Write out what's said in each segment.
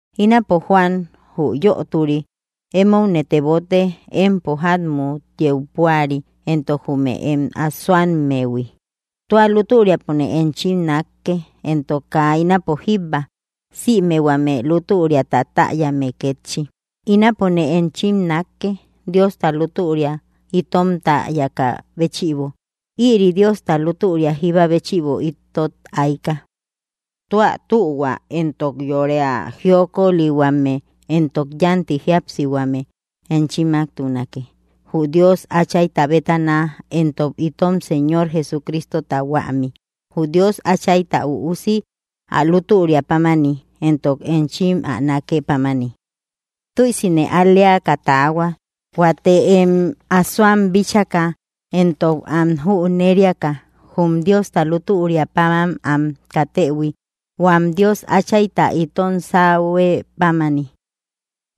Ínapo Juan, jü yöturi, émoune tebote, empo jámmut yeu púari, éntok jume em asoammehui. Tua lútüriapone enchim nákke, éntok kaa ínapo jíbba, sïme huame lútüriata täyame kétchi. Ínapone enchim nákke, Diosta lútüria itom täyakä béchïbo. Ïri Diosta lútüria jíba béchïbo itot aika. Tua tühua éntok yore ä jiokolihuame éntok yanti jíapsihuame enchimmaktunake, jü Dios Áchayta bétana, éntok itom Señor Jesucristota huämi, jü Dios Áchayta Üusi, ä lútüria pámani, éntok enchim ä nákë pámani. Tüisine al‑leaka taahuak, huate em asoam bíchaka éntok am jüneriaka jum Diosta lútüria páman am katëhui, huam Dios Áchayta itom sáhuë pámani.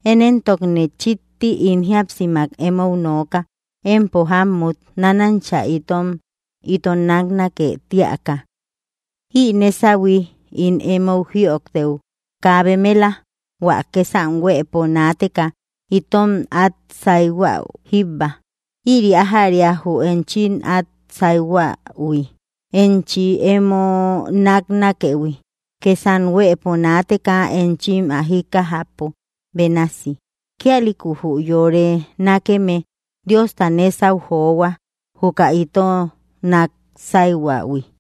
Én éntokne chikti ín jíapsimak emou nooka, empo jámmut, nánancha itom ito náknake tíaka. Ï nésahui ín emou jïojtëu kaa bemela, hua kësam huëpo naateka itom át sáihuäu jíbba. Ïri ájäria jü enchim át sáihuähui: Enchim emo náknakëhui, kësam huëpo naateka enchim ä jíkkajäpo bénasi. Kíalïku jü yore nákeme Diosta nésau johua, juka ito nák sáihuähui.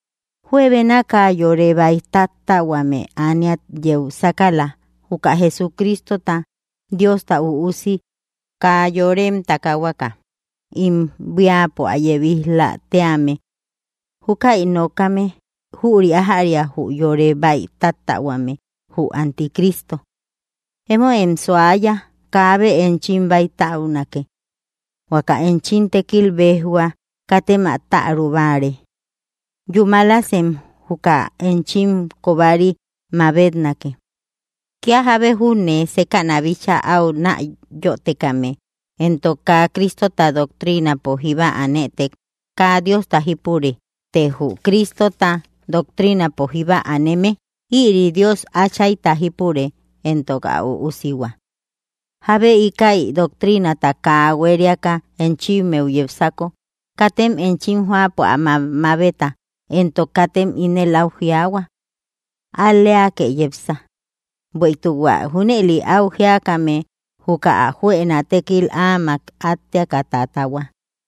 Juebénaka yore bäi táttähuame ániat yeu sákala, juka Jesucristota, Diosta Üusi, kaa yorem takahuaka ím buíapo ä yebij‑la tíame. Júkäi nokame, jüri ájäria jü yore bäitáttähuame, jü anticristo. Emóem suaya, kaabe enchim bäitäunake. Huaka enchim tékil béjhuä; katem ä täru báare. Yumälasem juka enchim kobari mabetnáke. Kía jábe júne sékäna bíchaa au näyotekame, entok kaa Cristota doctrinapo jíba anëtek, kaa Diosta jípure, të jü Cristota doctrinapo jíba aneme, ïri Dios Áchayta jípure éntok ä Üusihua. Jábe íkäi doctrinata kaa huériaka enchimmeu yepsako, katem enchim jóapo ä mamabeta, éntok katem ínel au jiaahua: “Al‑leake yepsa.” Bueïtuk hua junëli áu jíakame, juka ä juëna tékil áamak átteaka tatahua.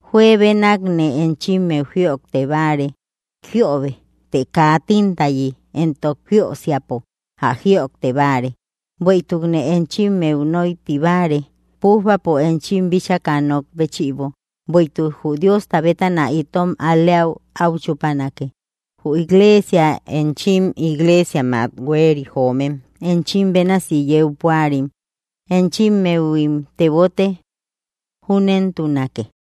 Juebenakne enchimmeu jïojtebáare jiöbe, të kaa tintayi entok jiösiapo ä jïojte báare, bueïtukne enchimmeu nóiti báare. Pújbapo enchim bíchaka nok béchïbo, bueïtuk jü Diosta bétana itom al-leäu au chupanake. Jü iglesia, enchim iglesiammak hueri joomem, enchim bénasi yeu púarim, enchimmehuim tebote. Júnentunake.